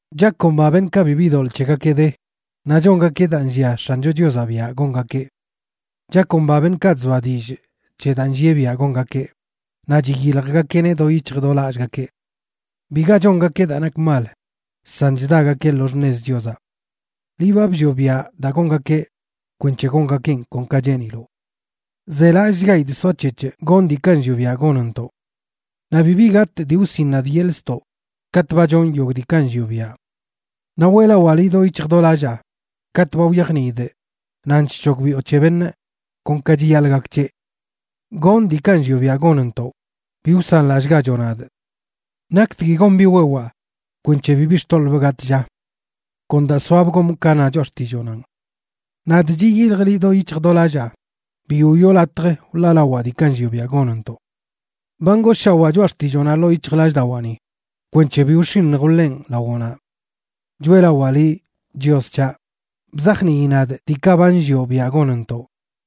Chakomba beṉꞌkaꞌ bibi doḻꞌ c̱hegakeꞌ de, naꞌ chongakeꞌ daa nllia X̱ancho Chiozaꞌ biaꞌ gongakeꞌ. Chakomba beṉꞌkaꞌ chzoa dillꞌ c̱he daa nllieꞌ biaꞌ gongakeꞌ, naꞌ chiyiljgakeꞌneꞌ do yic̱hj do lallꞌgakeꞌ. Biga chongakeꞌ daa nak mal, san chdagakeꞌ lo xṉez Chiozaꞌ. Liꞌ ba bllioꞌ biaꞌ daa gongakeꞌ kwenc̱he gongakeꞌn kon ka cheeniloꞌ. ¡Zelallꞌchgaidꞌ soac̱hec̱hꞌ gonꞌ diikaꞌ nllioꞌ biaꞌ gonntoꞌ! Naꞌ bibi gatꞌ dii wsiꞌn nadꞌ yeḻꞌ ztoꞌ katꞌ ba chonꞌ yogꞌ diikaꞌ nllioꞌ biaꞌ. Naꞌ weꞌlawaa liꞌ do yic̱hj do lallaa katꞌ ba wyajniidꞌ nan chc̱hogbiꞌo c̱he beṉꞌ kon ka chiyaḻꞌ gak c̱heꞌ. ¡Gonꞌ diikaꞌ nllioꞌ biaꞌ gonntoꞌ! ¡Bi wsanlallꞌgachoꞌ nadꞌ! ¿Naktgui gon biꞌ wewaa kwenc̱he bibi xtoḻꞌbꞌ gatꞌ, lla? Kon daa soabꞌ gomꞌ ka na choꞌa xtilloonanꞌ. Nadꞌ chiyiljꞌ liꞌ do yic̱hj do lallaa; bi wiꞌo latj wḻaalawaa diikaꞌ nllioꞌ biaꞌ gonntoꞌ. Ba ngooshawaa choꞌa xtilloonaꞌ ḻoo yic̱hjlallꞌdawaani kwenc̱he bi wx̱iṉj wḻenꞌ lawoꞌnaꞌ. ¡Choeꞌlawaa liꞌ, Chios c̱haꞌ! Bzajnii nadꞌ diikaꞌ ba nllioꞌ biaꞌ gonntoꞌ.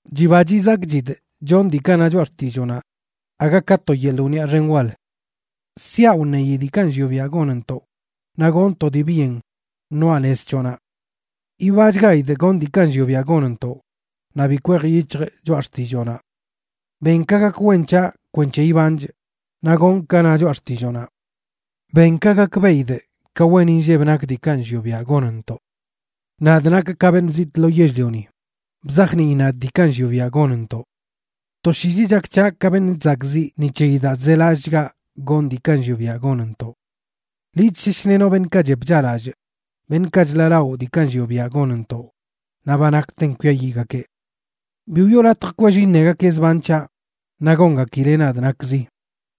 Chiba chizakchidꞌ chonꞌ diikaꞌ na choꞌa xtilloonaꞌ, aga ka to yeḻꞌ wniꞌa xen wal. Siaꞌ wṉeyi diikaꞌ nllioꞌ biaꞌ gonntoꞌ, naꞌ gonꞌ to dii byen ṉoaꞌ nez c̱hoꞌnaꞌ. Yibachgaidꞌ gonꞌ diikaꞌ nllioꞌ biaꞌ gonntoꞌ, naꞌ bi kwej yic̱hjꞌ choꞌa xtilloonaꞌ. Ben ka gak wen c̱haꞌ kwenc̱he ibanchꞌ naꞌ gonꞌ ka na choꞌa xtilloonaꞌ. Ben ka gakbeꞌidꞌ ka wen inlleb nak diikaꞌ nllioꞌ biaꞌ gonntoꞌ. Nadꞌ nakꞌ ka beṉꞌ zitꞌ lo yell-lioni; bzajnii nadꞌ diikaꞌ nllioꞌ biaꞌ gonntoꞌ. Toshiizi chak c̱haꞌ ka beṉꞌ chzakꞌziꞌ ni c̱heyi daa chzelallꞌchgaꞌ gonꞌ diikaꞌ nllioꞌ biaꞌ gonntoꞌ. Liꞌ chsheshlenoꞌ beṉꞌkaꞌ chep chaꞌlallꞌ, beṉꞌkaꞌ chḻaꞌlaꞌo diikaꞌ nllioꞌ biaꞌ gonntoꞌ, naꞌ ba nakten kwiayiꞌgakeꞌ. Bi wiꞌo latj kwell iṉegakeꞌ zban c̱haꞌ, naꞌ gongakileꞌ nadꞌ nakzi,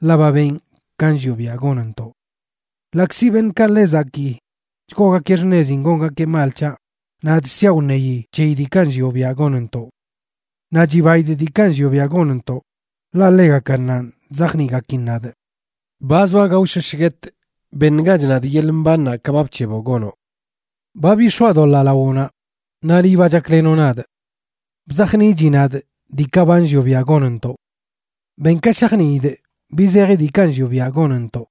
ḻaꞌ ba benꞌ ka nllioꞌ biaꞌ gonntoꞌ. Ḻaꞌkzi beṉꞌkaꞌ ḻe zakii chgoogakeꞌ xṉezin gongakeꞌ mal c̱haꞌ, nadꞌ siaꞌ wṉeyi c̱heyi diikaꞌ nllioꞌ biaꞌ gonntoꞌ. Naꞌ chibaidꞌ diikaꞌ nllioꞌ biaꞌ gonntoꞌ, ḻaꞌ ḻegakannanꞌ chzajniꞌgakin nadꞌ. Ba zoa gaoshosh guetꞌ, ¡beṉgach nadꞌ yeḻꞌ mbannaꞌ ka ba bc̱heboꞌ gonoꞌ! Ba bix̱oadoḻaa lawoꞌnaꞌ naꞌ liꞌ ba chaklenoꞌ nadꞌ. Bzajniꞌchi nadꞌ diikaꞌ ba nllioꞌ biaꞌ gonntoꞌ. Ben ka shajniidꞌ bi zeji diikaꞌ nllioꞌ biaꞌ gonntoꞌ,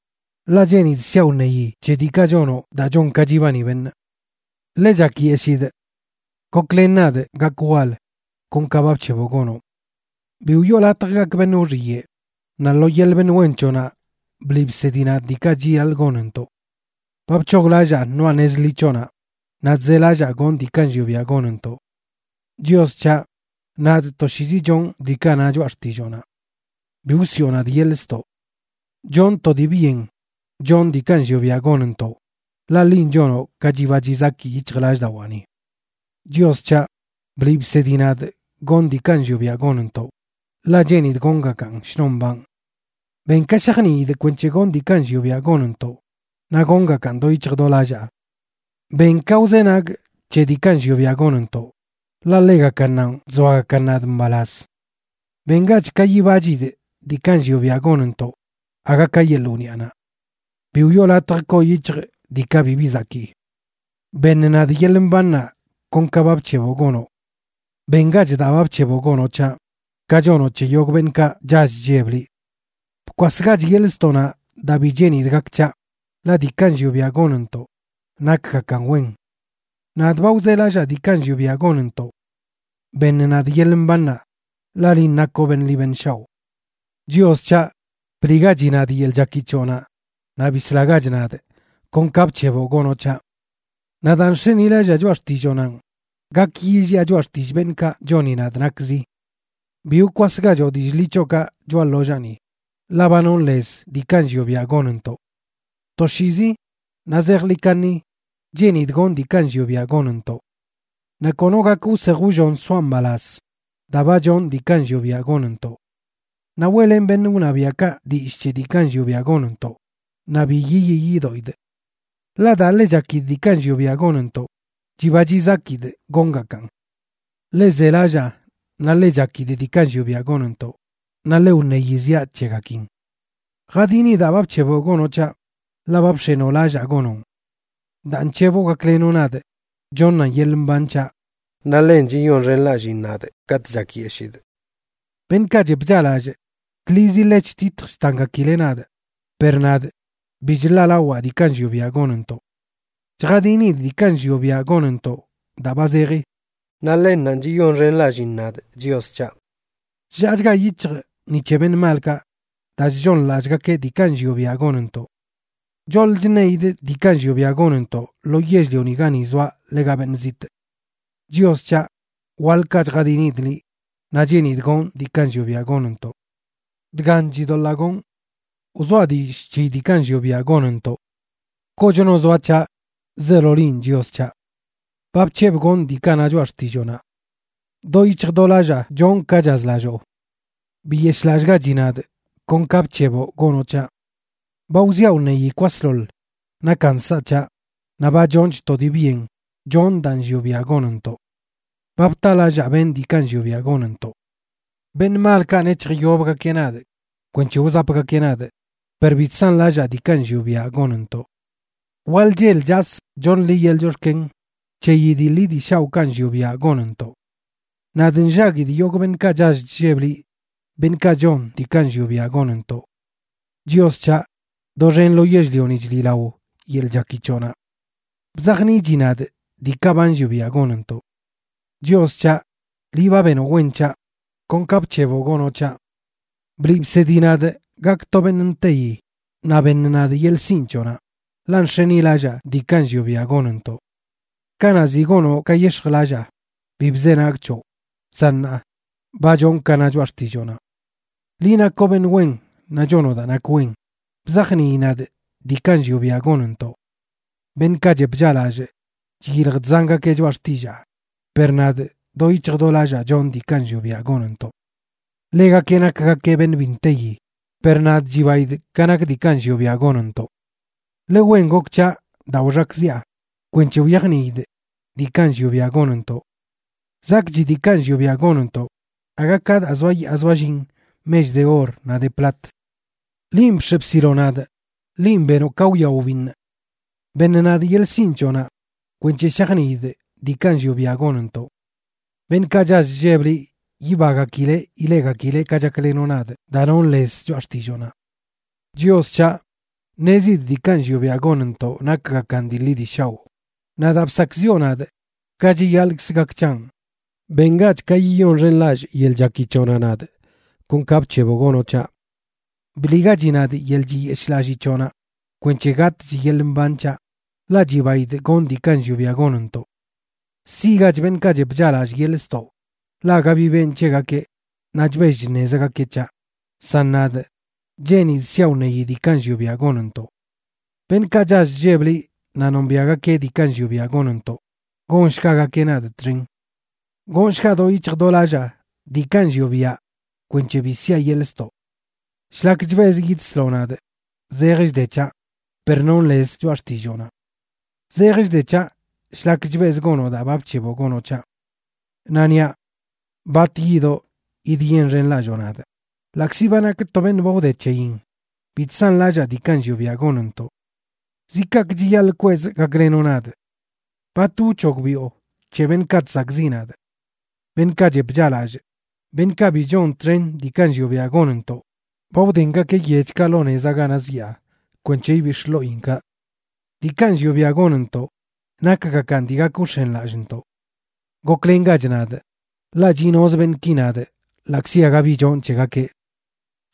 ḻaꞌ cheenidꞌ siaꞌ wṉeyi c̱he diikaꞌ chonoꞌ daa chon ka chibani beṉꞌ. Ḻe chakyeshidꞌ. Goklen nadꞌ gakꞌ wal, kon ka ba bc̱heboꞌ gonoꞌ. Bi wiꞌo latj gakꞌ beṉꞌ wxiyeꞌ; naꞌ lo yeḻꞌ beṉꞌ wen c̱hoꞌnaꞌ bliꞌ bsedi nadꞌ diikaꞌ chiyaḻꞌ gonntoꞌ. Ba bc̱hoglallaa ṉoaꞌ nez ḻi c̱hoꞌnaꞌ naꞌ chzelallaa gonꞌ diikaꞌ nllioꞌ biaꞌ gonntoꞌ. Chios c̱haꞌ, nadꞌ toshiizi chonꞌ diikaꞌ na choꞌa xtilloonaꞌ; ¡Bi wsiꞌo nadꞌ yeḻꞌ ztoꞌ! Chonꞌ to dii byen chonꞌ diikaꞌ nllioꞌ biaꞌ gonntoꞌ, ḻaꞌ linꞌ chonoꞌ ka chiba chizaki yic̱hjlallꞌdawaani. Chios c̱haꞌ, bliꞌ bsedi nadꞌ gonꞌ diikaꞌ nllioꞌ biaꞌ gonntoꞌ, ḻaꞌ cheenidꞌ gongakaꞌn shnon mbanꞌ. Ben ka shajniidꞌ kwenc̱he gonꞌ diikaꞌ nllioꞌ biaꞌ gonntoꞌ, naꞌ gongakaꞌn do yic̱hj do lallaa. Ben ka wzenagꞌ c̱he diikaꞌ nllioꞌ biaꞌ gonntoꞌ, ḻaꞌ ḻegakannanꞌ chzoagakan nadꞌ mbalaz. Bengach ka yibachidꞌ diikaꞌ nllioꞌ biaꞌ gonntoꞌ, aga ka yeḻꞌ wniꞌanaꞌ. Bi wiꞌo latj koo yic̱hjꞌ diikaꞌ bibi zakii. Beṉ nadꞌ yeḻꞌ mbannaꞌ kon ka ba bc̱heboꞌ gonoꞌ. Bengach daa ba bc̱heboꞌ gonoꞌ c̱haꞌ ka chonoꞌ c̱he yogꞌ beṉꞌkaꞌ chall chlleb liꞌ. Bkwasgach yeḻꞌ ztoꞌnaꞌ daa bi cheenidꞌ gak c̱haꞌ, ḻaꞌ diikaꞌ nllioꞌ biaꞌ gonntoꞌ nakgakan wen. Nadꞌ ba wzelallaa diikaꞌ nllioꞌ biaꞌ gonntoꞌ. Beṉ nadꞌ yeḻꞌ mbannaꞌ, ḻaꞌ linꞌ nakoꞌ beṉꞌ liꞌ beṉꞌ shaoꞌ. Chios c̱haꞌ, bliꞌgachi nadꞌ yeḻꞌ chaki c̱hoꞌnaꞌ naꞌ bislagach nadꞌ, kon ka bc̱heboꞌ gonoꞌ c̱haꞌ. Naꞌ daa nx̱enilallaa choꞌa xtilloonanꞌ, gak yilliꞌa choꞌa xtillꞌ beṉꞌkaꞌ choni nadꞌ nakzi. Bi wkwasgachoꞌ dillꞌ ḻi c̱hoꞌkaꞌ choꞌa ḻollaani, ḻaꞌ ba nonꞌ lez diikaꞌ nllioꞌ biaꞌ gonntoꞌ. Toshiizi, naꞌ zejḻi kaṉi cheenidꞌ gonꞌ diikaꞌ nllioꞌ biaꞌ gonntoꞌ. Naꞌ kono gak wsej wllon soaꞌ mbalaz, daa ba chonꞌ diikaꞌ nllioꞌ biaꞌ gonntoꞌ. Naꞌ weꞌlenꞌ beṉꞌ wṉabiaꞌkaꞌ dillꞌ c̱he diikaꞌ nllioꞌ biaꞌ gonntoꞌ naꞌ bi yiyii yidoꞌidꞌ. Ḻaꞌ daa ḻe chakidꞌ diikaꞌ nllioꞌ biaꞌ gonntoꞌ, chiba chizakidꞌ gongakaꞌn. Ḻe zelallaa naꞌ ḻe chakidꞌ diikaꞌ nllioꞌ biaꞌ gonntoꞌ, naꞌ ḻe wṉeyi ziaꞌ c̱hegakin. Jadini daa ba bc̱heboꞌ gonoꞌ c̱haꞌ, ḻaꞌ ba bx̱enoꞌ lallaa gonoꞌn. Daa nc̱heboꞌ gaklenoꞌ nadꞌ, choṉan yeḻꞌ mban c̱haꞌ, naꞌ ḻen chiyonxenlalliin nadꞌ katꞌ chakyeshidꞌ. Beṉꞌkaꞌ chep chaꞌlallꞌ, tlizi ḻe chtitj chtangakileꞌ nadꞌ, per nadꞌ bi chḻaꞌlawaa diikaꞌ nllioꞌ biaꞌ gonntoꞌ. Chjadinidꞌ diikaꞌ nllioꞌ biaꞌ gonntoꞌ daa ba zeji, naꞌ ḻennanꞌ chiyonxenlalliin nadꞌ, Chios c̱haꞌ. Chllaachga yic̱hjꞌ ni c̱he beṉꞌ malꞌkaꞌ daa chchooṉlallꞌgakeꞌ diikaꞌ nllioꞌ biaꞌ gonntoꞌ. Choḻ chṉeidꞌ diikaꞌ nllioꞌ biaꞌ gonntoꞌ lo yell-lioni gani zoaꞌ ḻega beṉꞌ zitꞌ. Chios c̱haꞌ, waḻkaꞌ chjadinidꞌ liꞌ, naꞌ cheenidꞌ gonꞌ diikaꞌ nllioꞌ biaꞌ gonntoꞌ. Dgan chidoḻaa gonꞌ: wzoaꞌ dillꞌ c̱heyi diikaꞌ nllioꞌ biaꞌ gonntoꞌ. Kochno zoa c̱haꞌ, zeelo linꞌ, Chios c̱haꞌ. Ba bc̱hebꞌ gonꞌ diikaꞌ na choꞌa xtilloonaꞌ. Do yic̱hj do lallaa chonꞌ ka chazlalloo. Biyeshꞌlallꞌgachi nadꞌ kon ka bc̱heboꞌ gonoꞌ c̱haꞌ. Ba wziaꞌ wṉeyi kwasḻoḻ nakan nsaꞌ c̱haꞌ naꞌ ba chonchꞌ to dii byen chonꞌ daa nllioꞌ biaꞌ gonntoꞌ. Ba btalallaa benꞌ diikaꞌ nllioꞌ biaꞌ gonntoꞌ. Beṉꞌ malkaꞌ nec̱hjyobgakeꞌ nadꞌ kwenc̱he wzapgakeꞌ nadꞌ, per bi chsanlallaa diikaꞌ nllioꞌ biaꞌ gonntoꞌ. Waḻ chel chasꞌ choṉꞌ liꞌ yeḻꞌ chox̱ken c̱heyi dii ḻi dii shaoꞌkaꞌ nllioꞌ biaꞌ gonntoꞌ. Nadꞌ nllaguidꞌ yogꞌ beṉꞌkaꞌ chall chlleb liꞌ, beṉꞌkaꞌ chon diikaꞌ nllioꞌ biaꞌ gonntoꞌ. Chios c̱haꞌ, doxen lo yell-lioni chliꞌlao yeḻꞌ chaki c̱hoꞌnaꞌ. Bzajniꞌchi nadꞌ diikaꞌ ba nllioꞌ biaꞌ gonntoꞌ. Chios c̱haꞌ, liꞌ ba benoꞌ wen c̱haꞌ, kon ka bc̱heboꞌ gonoꞌ c̱haꞌ. Bliꞌ bsedi nadꞌ gakꞌ to beṉꞌ nteyi naꞌ beṉ nadꞌ yeḻꞌ sinꞌ c̱hoꞌnaꞌ, ḻaꞌ nx̱enilallaa diikaꞌ nllioꞌ biaꞌ gonntoꞌ. Kanaꞌ ziꞌ gonoꞌ ka yex̱jlallaa, bi bzenagꞌ c̱hoꞌ, san ṉaa, ba chonꞌ ka na choꞌa xtilloonaꞌ. Liꞌ nakoꞌ beṉꞌ wen naꞌ chonoꞌ daa nak wen; bzajnii nadꞌ diikaꞌ nllioꞌ biaꞌ gonntoꞌ. Beṉꞌkaꞌ chep chaꞌlallꞌ chyilj chzangakeꞌ choꞌa xtillaa, per nadꞌ do yic̱hj do lallaa chonꞌ diikaꞌ nllioꞌ biaꞌ gonntoꞌ. Ḻegakeꞌ nakgakeꞌ beṉꞌ bi nteyi, per nadꞌ, chibaidꞌ ka nak diikaꞌ nllioꞌ biaꞌ gonntoꞌ. Ḻe wen gok c̱haꞌ daa wxakꞌziꞌa, kwenc̱he wyajniidꞌ diikaꞌ nllioꞌ biaꞌ gonntoꞌ. Zakꞌchi diikaꞌ nllioꞌ biaꞌ gonntoꞌ aga ka daa zoayaa zoallin mech de or naꞌ de plat. Linꞌ bx̱e bsiloꞌ nadꞌ. Linꞌ benoꞌ ka wya wbiṉꞌ. Beṉ nadꞌ yeḻꞌ sinꞌ c̱hoꞌnaꞌ kwenc̱he shajniidꞌ diikaꞌ nllioꞌ biaꞌ gonntoꞌ. Beṉꞌkaꞌ chall chlleb liꞌ yibagakileꞌ ileꞌgakileꞌ ka chaklenoꞌ nadꞌ daa nonꞌ lez choꞌa xtilloonaꞌ. Chios c̱haꞌ, ṉezidꞌ diikaꞌ nllioꞌ biaꞌ gonntoꞌ nakgakan dii ḻi dii shaoꞌ, naꞌ daa bsakꞌziꞌo nadꞌ, ka chiyaḻꞌkz gak c̱hanꞌ. Bengach ka yiyonxenlallꞌ yeḻꞌ chaki c̱hoꞌnaꞌ nadꞌ, kon ka bc̱heboꞌ gonoꞌ c̱haꞌ. Bliꞌgachi nadꞌ yeḻꞌ chiyeshꞌlallii c̱hoꞌnaꞌ kwenc̱he gatꞌch yeḻꞌ mban c̱haꞌ, ḻaꞌ chibaidꞌ gonꞌ diikaꞌ nllioꞌ biaꞌ gonntoꞌ. Siꞌgach beṉꞌkaꞌ chep chaꞌlallꞌ yeḻꞌ ztoꞌ, ḻaꞌ aga bi benꞌ c̱hegakeꞌ naꞌ chbell chṉezgakeꞌ c̱haꞌ; san nadꞌ, cheenidꞌ siaꞌ wṉeyi diikaꞌ nllioꞌ biaꞌ gonntoꞌ. Beṉꞌkaꞌ chall chlleb liꞌ naꞌ nombiaꞌgakeꞌ diikaꞌ nllioꞌ biaꞌ gonntoꞌ, gonshgagakeꞌ nadꞌ txen. Gonshgaꞌ do yic̱hj do lallaa diikaꞌ nllioꞌ biaꞌ kwenc̱he bi siꞌa yeḻꞌ ztoꞌ. Shlak chbezꞌ yidsloꞌ nadꞌ zej chde c̱haꞌ, per nonꞌ lez choꞌa xtilloonaꞌ. Zej chde c̱haꞌ shlak chbezꞌ gonoꞌ daa ba bc̱heboꞌ gonoꞌ c̱haꞌ. Naꞌ niaꞌ: “¿Bat yidoꞌ yidyenxenlalloo nadꞌ?” Ḻaꞌkzi ba nakꞌ to beṉꞌ ba wde c̱heyin, bi chsanlallaa diikaꞌ nllioꞌ biaꞌ gonntoꞌ. ¿Zi kaꞌkꞌ chiyaḻꞌ kwezꞌ gaklenoꞌ nadꞌ? ¿Bat wc̱hogbiꞌo c̱he beṉꞌkaꞌ chsakꞌziꞌ nadꞌ? Beṉꞌkaꞌ chep chaꞌlallꞌ, beṉꞌkaꞌ bi chon txen diikaꞌ nllioꞌ biaꞌ gonntoꞌ, ba wdengakeꞌ yechkaꞌ lo nezaꞌ ganaꞌ zyaa kwenc̱he ibix̱ꞌ ḻoꞌinkaꞌ. Diikaꞌ nllioꞌ biaꞌ gonntoꞌ nakgakan dii gak wx̱enlallꞌntoꞌ. Goklengach nadꞌ, ḻaꞌ chiꞌnoz beṉꞌki nadꞌ ḻaꞌkzi aga bi chonꞌ c̱hegakeꞌ.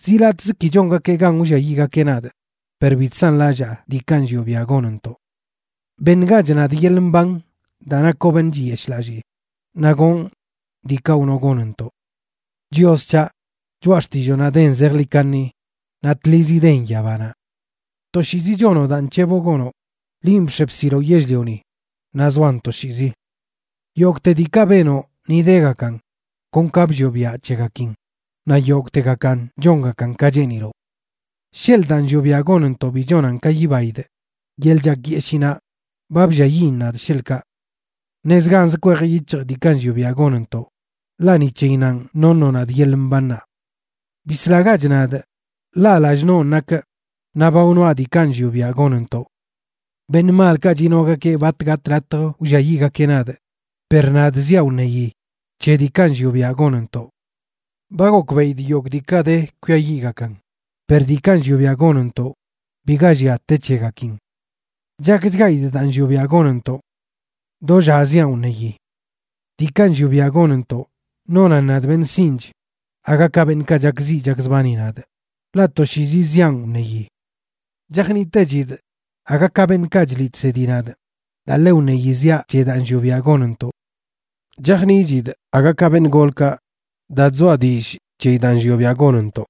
Zi latꞌzə ki chongakeꞌ gan wlliayiꞌgakeꞌ nadꞌ, per bi chsanlallaa diikaꞌ nllioꞌ biaꞌ gonntoꞌ. Beṉgach nadꞌ yeḻꞌ mban daa nakoꞌ beṉꞌ chiyeshꞌlallii, naꞌ gonꞌ diikaꞌ wnoꞌ gonntoꞌ. Chios c̱haꞌ, choꞌa xtilloonaꞌ den zejḻi kaṉi naꞌ tlizi den yabanaꞌ. Toshiizi chonoꞌ daa nc̱heboꞌ gonoꞌ; linꞌ bx̱e bsiloꞌ yell-lioni naꞌ zoan toshiizi. Yogꞌte diikaꞌ benoꞌ ni degakan kon ka bllioꞌ biaꞌ c̱hegakin, naꞌ yogꞌtegakan chongakan ka cheeniloꞌ. Sheḻꞌ daa nllioꞌ biaꞌ gonntoꞌ bi chonan ka yibaidꞌ yeḻꞌ chakyeshiinaꞌ ba blliayiꞌn nadꞌ, sheḻꞌkaꞌ. Ṉezganz kwej yic̱hjꞌ diikaꞌ nllioꞌ biaꞌ gonntoꞌ, ḻaꞌ ni c̱heyinnanꞌ noṉoꞌ nadꞌ yeḻꞌ mbannaꞌ. Bislagach nadꞌ, ḻaꞌ lallꞌ nonꞌ nakꞌ naꞌ ba wnoaꞌ diikaꞌ nllioꞌ biaꞌ gonntoꞌ. Beṉꞌ malkaꞌ chinogakeꞌ bat gatꞌ latj wlliayiꞌgakeꞌ nadꞌ, per nadꞌ ziaꞌ wṉeyi c̱he diikaꞌ nllioꞌ biaꞌ gonntoꞌ. Ba gokbeꞌidꞌ yogꞌ diikaꞌ de kwiayiꞌgakan, per diikaꞌ nllioꞌ biaꞌ gonntoꞌ biga llia te c̱hegakin. Chakchgaidꞌ daa nllioꞌ biaꞌ gonntoꞌ. Do lla ziaꞌn wṉeyi. Diikaꞌ nllioꞌ biaꞌ gonntoꞌ nonan nadꞌ beṉꞌ sinꞌch aga ka beṉꞌkaꞌ chakziꞌ chakzbani nadꞌ, ḻaꞌ toshiizi ziaꞌn wṉeyi. Chajniꞌtechidꞌ aga ka beṉꞌkaꞌ chliꞌ chsedi nadꞌ daa ḻe wṉeyi ziaꞌ c̱he daa nllioꞌ biaꞌ gonntoꞌ. Chajniꞌchidꞌ aga ka beṉꞌ golkaꞌ daa chzoa dillꞌ c̱heyi daa nllioꞌ biaꞌ gonntoꞌ.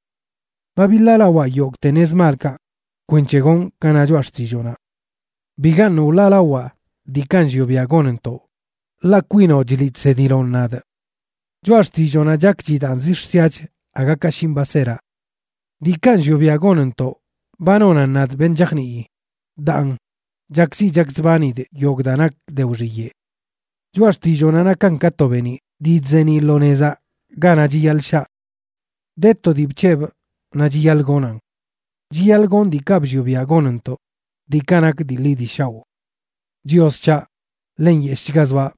Ba biḻaalawaa yogꞌte nez malkaꞌ kwenc̱he gonꞌ ka na choꞌa xtilloonaꞌ. Bigaṉꞌ wḻaalawaa diikaꞌ nllioꞌ biaꞌ gonntoꞌ, ḻaꞌ kwinoꞌ chliꞌ chsediloꞌn nadꞌ. Choꞌa xtilloonaꞌ chakchidaꞌn zix̱ siach aga ka shinꞌ baseraꞌ. Diikaꞌ nllioꞌ biaꞌ gonntoꞌ ba nonan nadꞌ beṉꞌ chajnii, daan, chakziꞌ chakzbanidꞌ yogꞌ daa nak de wxiyeꞌ. Choꞌa xtilloonaꞌ nakan ka to beeniꞌ dii chzeeniꞌ lo nezaꞌ ganaꞌ chiyaḻꞌ shaa. De to dii bc̱hebꞌ, naꞌ chiyaḻꞌ gonan: chiyaḻꞌ gonꞌ diikaꞌ bllioꞌ biaꞌ gonntoꞌ, diikaꞌ nak dii ḻi dii shaoꞌ. Chios c̱haꞌ, ḻe nyeshꞌchga zoaꞌ;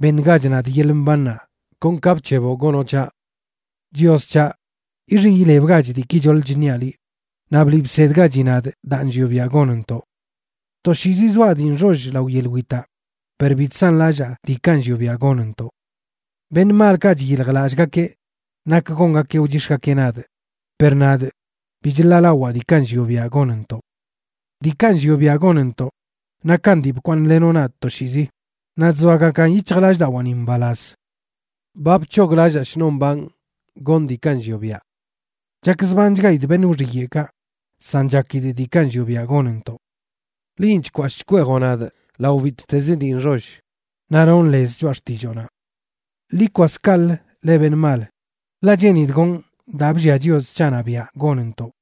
beṉgach nadꞌ yeḻꞌ mbannaꞌ, kon ka bc̱heboꞌ gonoꞌ c̱haꞌ. Chios c̱haꞌ, ixiꞌ ilebgach diiki choḻ chṉiaꞌ liꞌ, naꞌ bliꞌ bsedgachi nadꞌ daa nllioꞌ biaꞌ gonntoꞌ. Toshiizi zoaꞌ dii nxoll lao yeḻꞌ witaꞌ, per bi chsanlallaa diikaꞌ nllioꞌ biaꞌ gonntoꞌ. Beṉꞌ malkaꞌ chyiljlallꞌgakeꞌ nak gongakeꞌ wchix̱gakeꞌ nadꞌ, per nadꞌ, bi chḻaꞌlawaa diikaꞌ nllioꞌ biaꞌ gonntoꞌ. Diikaꞌ nllioꞌ biaꞌ gonntoꞌ nakan dii bkwaaṉꞌlenoꞌ nadꞌ toshiizi, naꞌ chzoagakan yic̱hjlallꞌdawaani mbalaz. Ba bc̱hoglallaa shnon mbanꞌ gonꞌ diikaꞌ nllioꞌ biaꞌ. Chakzbanchgaidꞌ beṉꞌ wxiyeꞌkaꞌ, san chakidꞌ diikaꞌ nllioꞌ biaꞌ gonntoꞌ. Linꞌ chkwashꞌ chkweejoꞌ nadꞌ lao bittez dii nxoll, naꞌ nonꞌ lez choꞌa xtilloonaꞌ. Ḻi kwas kaꞌlə, leꞌ beṉꞌ mal, ḻaꞌ cheenidꞌ gonꞌ daa bllia Chios c̱haꞌnaꞌ biaꞌ gonntoꞌ.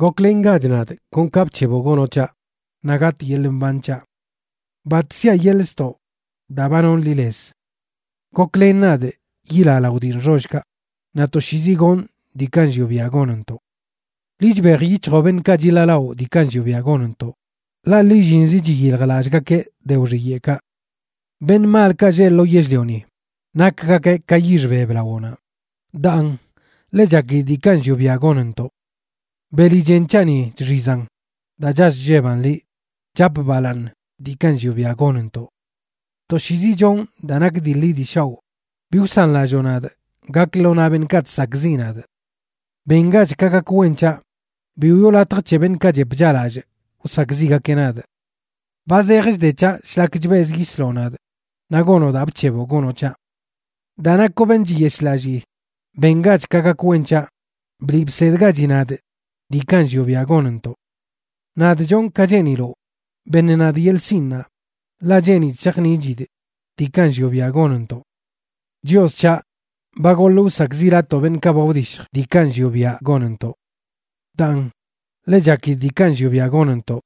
Goklengach nadꞌ kon ka bc̱heboꞌ gonoꞌ c̱haꞌ, naꞌ gatꞌ yeḻꞌ mban c̱haꞌ. Bat siaꞌ yeḻꞌ ztoꞌ daa ba nonꞌ liꞌ lez. Goklen nadꞌ yilaꞌ lao dii nxollkaꞌ, naꞌ toshiizi gonꞌ diikaꞌ nllioꞌ biaꞌ gonntoꞌ. Liꞌ chbej yic̱hjoꞌ beṉꞌkaꞌ chiḻaalaꞌo diikaꞌ nllioꞌ biaꞌ gonntoꞌ, ḻaꞌ lillinzi chiyiljlallꞌgakeꞌ de wxiyeꞌkaꞌ. Beṉꞌ malkaꞌ lleꞌ lo yell-lioni nakgakeꞌ ka yix beb lawoꞌnaꞌ, daan, ḻe chakidꞌ diikaꞌ nllioꞌ biaꞌ gonntoꞌ. Beli chen c̱haꞌni chxizan daa chall chlleban liꞌ, chapꞌ balaaṉ diikaꞌ nllioꞌ biaꞌ gonntoꞌ. Toshiizi chonꞌ daa nak dii ḻi dii shaoꞌ; bi wsanlalloꞌ nadꞌ gakꞌ lo naꞌ beṉꞌkaꞌ chsakꞌziꞌ nadꞌ. Bengach ka gak wen c̱haꞌ; bi wiꞌo latj c̱he beṉꞌkaꞌ chep chaꞌlallꞌ wsakꞌziꞌgakeꞌ nadꞌ. Ba zej chde c̱haꞌ shlak chbezꞌ yisloꞌ nadꞌ naꞌ gonoꞌ daa bc̱heboꞌ gonoꞌ c̱haꞌ. Daa nakoꞌ beṉꞌ chiyeshꞌlallii, bengach ka gak wen c̱haꞌ; bliꞌ bsedgachi nadꞌ diikaꞌ nllioꞌ biaꞌ gonntoꞌ. Nadꞌ chonꞌ ka cheeniloꞌ. Beṉ nadꞌ yeḻꞌ sinꞌnaꞌ ḻaꞌ cheenidꞌ shajniꞌchidꞌ diikaꞌ nllioꞌ biaꞌ gonntoꞌ. Chios c̱haꞌ, ba goḻꞌ wsakꞌziꞌlatoo beṉꞌkaꞌ ba wdishj diikaꞌ nllioꞌ biaꞌ gonntoꞌ. Daan, ḻe chakidꞌ diikaꞌ nllioꞌ biaꞌ gonntoꞌ;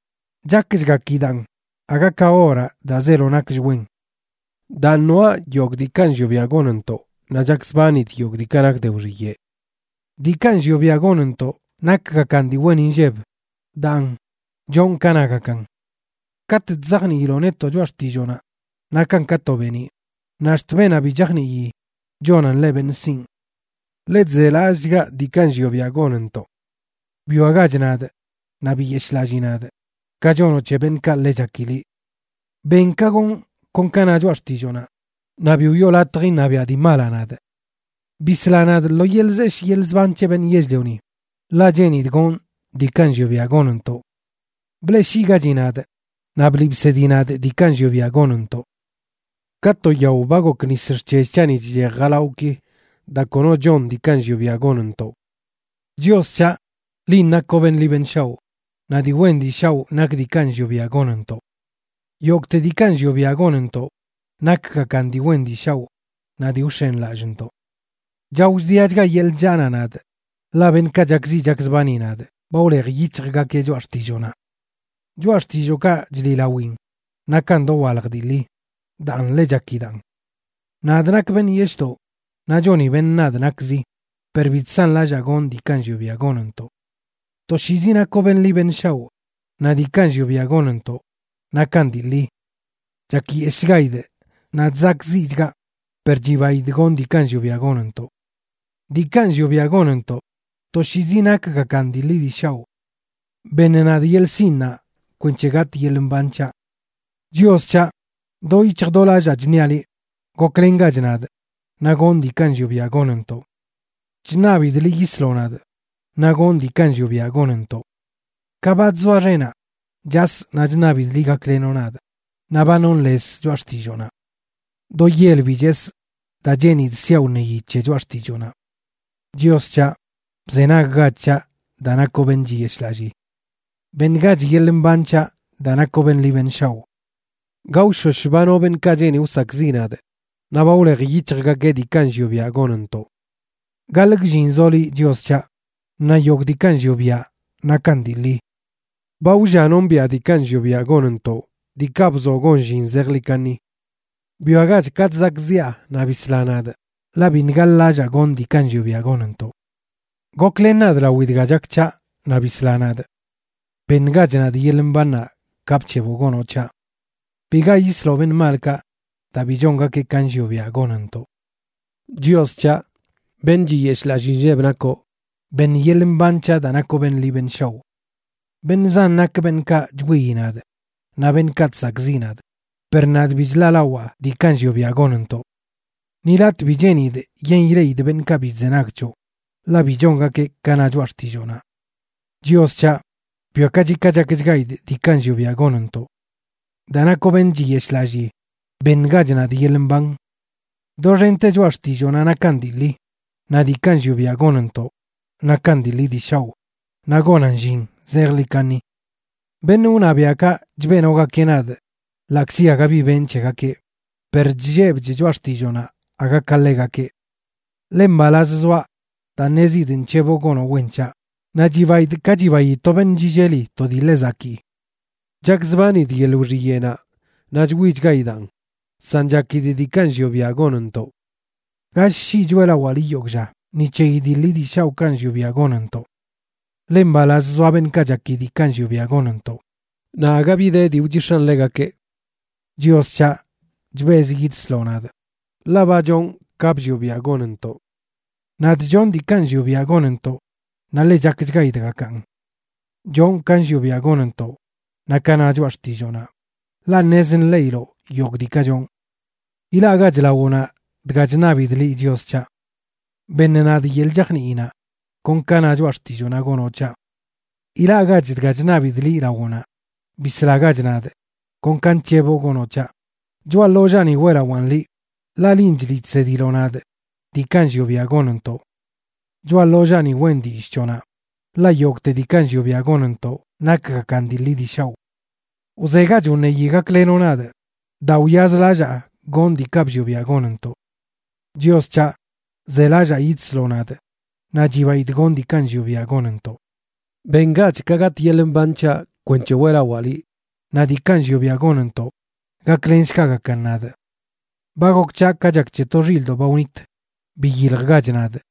chakchgakidaꞌn aga ka oraꞌ daa zeelo nakch wen. Daan, noaꞌ yogꞌ diikaꞌ nllioꞌ biaꞌ gonntoꞌ naꞌ chakzbanidꞌ yogꞌ diikaꞌ nak de wxiyeꞌ. Diikaꞌ nllioꞌ biaꞌ gonntoꞌ nakgakan dii wen inlleb; daan, chonꞌ ka nagakan. Katꞌ chzajniiloꞌ netoꞌ choꞌa xtilloonaꞌ nakan ka to beeniꞌ, naꞌ ax̱t beenaꞌ bi chajnii chonan ḻeꞌ beṉꞌ sinꞌ. Ḻe chzelallꞌchgaꞌ diikaꞌ nllioꞌ biaꞌ gonntoꞌ. Bwiagach nadꞌ, naꞌ biyeshꞌlallii nadꞌ, ka chonoꞌ c̱he beṉꞌkaꞌ ḻe chaki liꞌ. Ben ka gonꞌ kon ka na choꞌa xtilloonaꞌ; naꞌ bi wiꞌo latj iṉabiaꞌ dii malaꞌ nadꞌ. Bisla nadꞌ lo yeḻꞌ zeshꞌ yeḻꞌ zban c̱he beṉꞌ yell-lioni, ḻaꞌ cheenidꞌ gonꞌ diikaꞌ nllioꞌ biaꞌ gonntoꞌ. Bleꞌshiigachi nadꞌ, naꞌ bliꞌ bsedi nadꞌ diikaꞌ nllioꞌ biaꞌ gonntoꞌ. Ka to yao ba gok nis xc̱hell c̱haꞌni chchej jalawꞌki daa kono chon diikaꞌ nllioꞌ biaꞌ gonntoꞌ. Chios c̱haꞌ, linꞌ nakoꞌ beṉꞌ ḻi beṉꞌ shaoꞌ, naꞌ dii wen dii shaoꞌ nak diikaꞌ nllioꞌ biaꞌ gonntoꞌ. Yogꞌte diikaꞌ nllioꞌ biaꞌ gonntoꞌ nakgakan dii wen dii shaoꞌ naꞌ dii wx̱enlallꞌntoꞌ. Chao chdiachga yeḻꞌ chllaanaꞌ nadꞌ ḻaꞌ beṉꞌkaꞌ chakziꞌ chakzbani nadꞌ ba wlej yic̱hjgakeꞌ choꞌa xtilloonaꞌ. Choꞌa xtillookaꞌ chliꞌlawin nakan dowalj dii ḻi, daan, ḻe chakidaꞌn. Nadꞌ nakꞌ beṉꞌ yeshꞌdoꞌ naꞌ choni beṉꞌ nadꞌ nakzi, per bi chsanlallaa gonꞌ diikaꞌ nllioꞌ biaꞌ gonntoꞌ. Toshiizi nakoꞌ beṉꞌ ḻi beṉꞌ shaoꞌ, naꞌ diikaꞌ nllioꞌ biaꞌ gonntoꞌ nakan dii ḻi. Chakyeshꞌchgaidꞌ naꞌ chzakꞌziꞌchgaꞌ, per chibaidꞌ gonꞌ diikaꞌ nllioꞌ biaꞌ gonntoꞌ. Diikaꞌ nllioꞌ biaꞌ gonntoꞌ toshiizi nakgakan dii ḻi dii shaoꞌ. ¡Beṉ nadꞌ yeḻꞌ sinꞌnaꞌ kwenc̱he gatꞌ yeḻꞌ mban c̱haꞌ! Chios c̱haꞌ, do yic̱hj do lallaa chṉiaꞌ ḻi; goklengach nadꞌ, naꞌ gonꞌ diikaꞌ nllioꞌ biaꞌ gonntoꞌ. Chṉabidꞌ liꞌ yisloꞌ nadꞌ, naꞌ gonꞌ diikaꞌ nllioꞌ biaꞌ gonntoꞌ. Ka ba chzoa xenaꞌ, chasꞌ naꞌ chṉabidꞌ liꞌ gaklenoꞌ nadꞌ, naꞌ ba nonꞌ lez choꞌa xtilloonaꞌ. Do yel bi chesꞌ daa cheenidꞌ siaꞌ wṉeyi c̱he choꞌa xtilloonaꞌ. Chios c̱haꞌ, bzenaggach c̱haꞌ daa nakoꞌ beṉꞌ chiyeshꞌlallii. Beṉgach yeḻꞌ mban c̱haꞌ daa nakoꞌ beṉꞌ ḻi beṉꞌ shaoꞌ. Gaoshosh ba no beṉꞌkaꞌ cheeni wsakꞌziꞌ nadꞌ, naꞌ ba wlej yic̱hjgakeꞌ diikaꞌ nllioꞌ biaꞌ gonntoꞌ. Gaḻꞌ gllin zoꞌ liꞌ, Chios c̱haꞌ, naꞌ yogꞌ diikaꞌ nllioꞌ biaꞌ nakan dii ḻi. Ba wlla nombiꞌa diikaꞌ nllioꞌ biaꞌ gonntoꞌ, diikaꞌ bzoꞌ gon llin zejḻi kaṉi. Bwiagach ka chzakꞌziꞌa naꞌ bisla nadꞌ, ḻaꞌ biṉꞌ gaḻ-lallaa gonꞌ diikaꞌ nllioꞌ biaꞌ gonntoꞌ. Goklen nadꞌ lawi dga chak c̱haꞌ naꞌ bisla nadꞌ. Beṉgach nadꞌ yeḻꞌ mbannaꞌ, ka bc̱heboꞌ gonoꞌ c̱haꞌ. Biga yisloꞌ beṉꞌ malkaꞌ, daa bi chongakeꞌ ka nllioꞌ biaꞌ gonntoꞌ. Chios c̱haꞌ, beṉꞌ chiyeshꞌlallii nlleb nakoꞌ; beṉ yeḻꞌ mban c̱haꞌ daa nakoꞌ beṉꞌ ḻi beṉꞌ shaoꞌ. Beṉꞌ zan nak beṉꞌkaꞌ chwiyi nadꞌ naꞌ beṉꞌkaꞌ chsakꞌziꞌ nadꞌ, per nadꞌ bi chḻaꞌlawaa diikaꞌ nllioꞌ biaꞌ gonntoꞌ. Ni latꞌ bi cheenidꞌ yen ileꞌidꞌ beṉꞌkaꞌ bi chzenag c̱hoꞌ, ḻaꞌ bi chongakeꞌ ka na choꞌa xtilloonaꞌ. Chios c̱haꞌ, bwiakachi ka chakchgaidꞌ diikaꞌ nllioꞌ biaꞌ gonntoꞌ. Daa nakoꞌ beṉꞌ chiyeshꞌlallii, beṉgach nadꞌ yeḻꞌ mban. Doxente choꞌa xtilloonaꞌ nakan dii ḻi; naꞌ diikaꞌ nllioꞌ biaꞌ gonntoꞌ nakan dii ḻi dii shaoꞌ naꞌ gonan llin zejḻi kaṉi. Beṉꞌ wṉabiaꞌkaꞌ chbeꞌnogakeꞌ nadꞌ ḻaꞌkzi aga bi benꞌ c̱hegakeꞌ, per chllebchꞌ choꞌa xtilloonaꞌ aga ka ḻegakeꞌ. Ḻe mbalaz zoaꞌ daa ṉezidꞌ nc̱heboꞌ gonoꞌ wen c̱haꞌ, naꞌ chibaidꞌ ka chibayi to beṉꞌ chilleli to dii ḻe zakii. Chakzbanidꞌ yeḻꞌ wxiyeꞌnaꞌ, naꞌ chwichgaidaan, san chakidꞌ diikaꞌ nllioꞌ biaꞌ gonntoꞌ. Gall shii choeꞌlawaa liꞌ yogꞌ lla ni c̱heyi dii ḻi dii shaoꞌkaꞌ nllioꞌ biaꞌ gonntoꞌ. Ḻe mbalaz zoa beṉꞌkaꞌ chaki diikaꞌ nllioꞌ biaꞌ gonntoꞌ, naꞌ aga bi de dii wchix̱an ḻegakeꞌ. Chios c̱haꞌ, chbezꞌ yidsloꞌ nadꞌ, ḻaꞌ ba chonꞌ ka bllioꞌ biaꞌ gonntoꞌ. Nadꞌ chonꞌ diikaꞌ nllioꞌ biaꞌ gonntoꞌ naꞌ ḻe chakchgaidꞌgakan. Chonꞌ ka nllioꞌ biaꞌ gonntoꞌ naꞌ ka na choꞌa xtilloonaꞌ, ḻaꞌ ṉez ṉleꞌiloꞌ yogꞌ diikaꞌ chonꞌ. Ilaꞌgach lawoꞌnaꞌ dga chṉabidꞌ liꞌ, Chios c̱haꞌ. Beṉ nadꞌ yeḻꞌ chajniinaꞌ, kon ka na choꞌa xtilloonaꞌ gonoꞌ c̱haꞌ. Ilaꞌgach dga chṉabidꞌ liꞌ lawoꞌnaꞌ. Bislagach nadꞌ, kon ka nc̱heboꞌ gonoꞌ c̱haꞌ. Choꞌa ḻollaani weꞌlawaꞌn liꞌ, ḻaꞌ linꞌ chliꞌ chsediloꞌ nadꞌ diikaꞌ nllioꞌ biaꞌ gonntoꞌ. Choꞌa ḻollaani weꞌn dillꞌ c̱hoꞌnaꞌ, ḻaꞌ yogꞌte diikaꞌ nllioꞌ biaꞌ gonntoꞌ nakgakan dii ḻi dii shaoꞌ. Wzegach wṉeyi gaklenoꞌ nadꞌ, daa wyazlallaa gonꞌ diikaꞌ bllioꞌ biaꞌ gonntoꞌ. Chios c̱haꞌ, zelallaa yidsloꞌ nadꞌ, naꞌ chibaidꞌ gonꞌ diikaꞌ nllioꞌ biaꞌ gonntoꞌ. Bengach ka gatꞌ yeḻꞌ mban c̱haꞌ kwenc̱he weꞌlawaa liꞌ, naꞌ diikaꞌ nllioꞌ biaꞌ gonntoꞌ gaklenshgagakan nadꞌ. Ba gok c̱haꞌ ka chak c̱he to xilꞌdoꞌ ba wnit. Biyiljgach nadꞌ,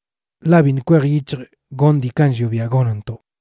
ḻaꞌ biṉꞌ kwej yic̱hjꞌ gonꞌ diikaꞌ nllioꞌ biaꞌ gonntoꞌ.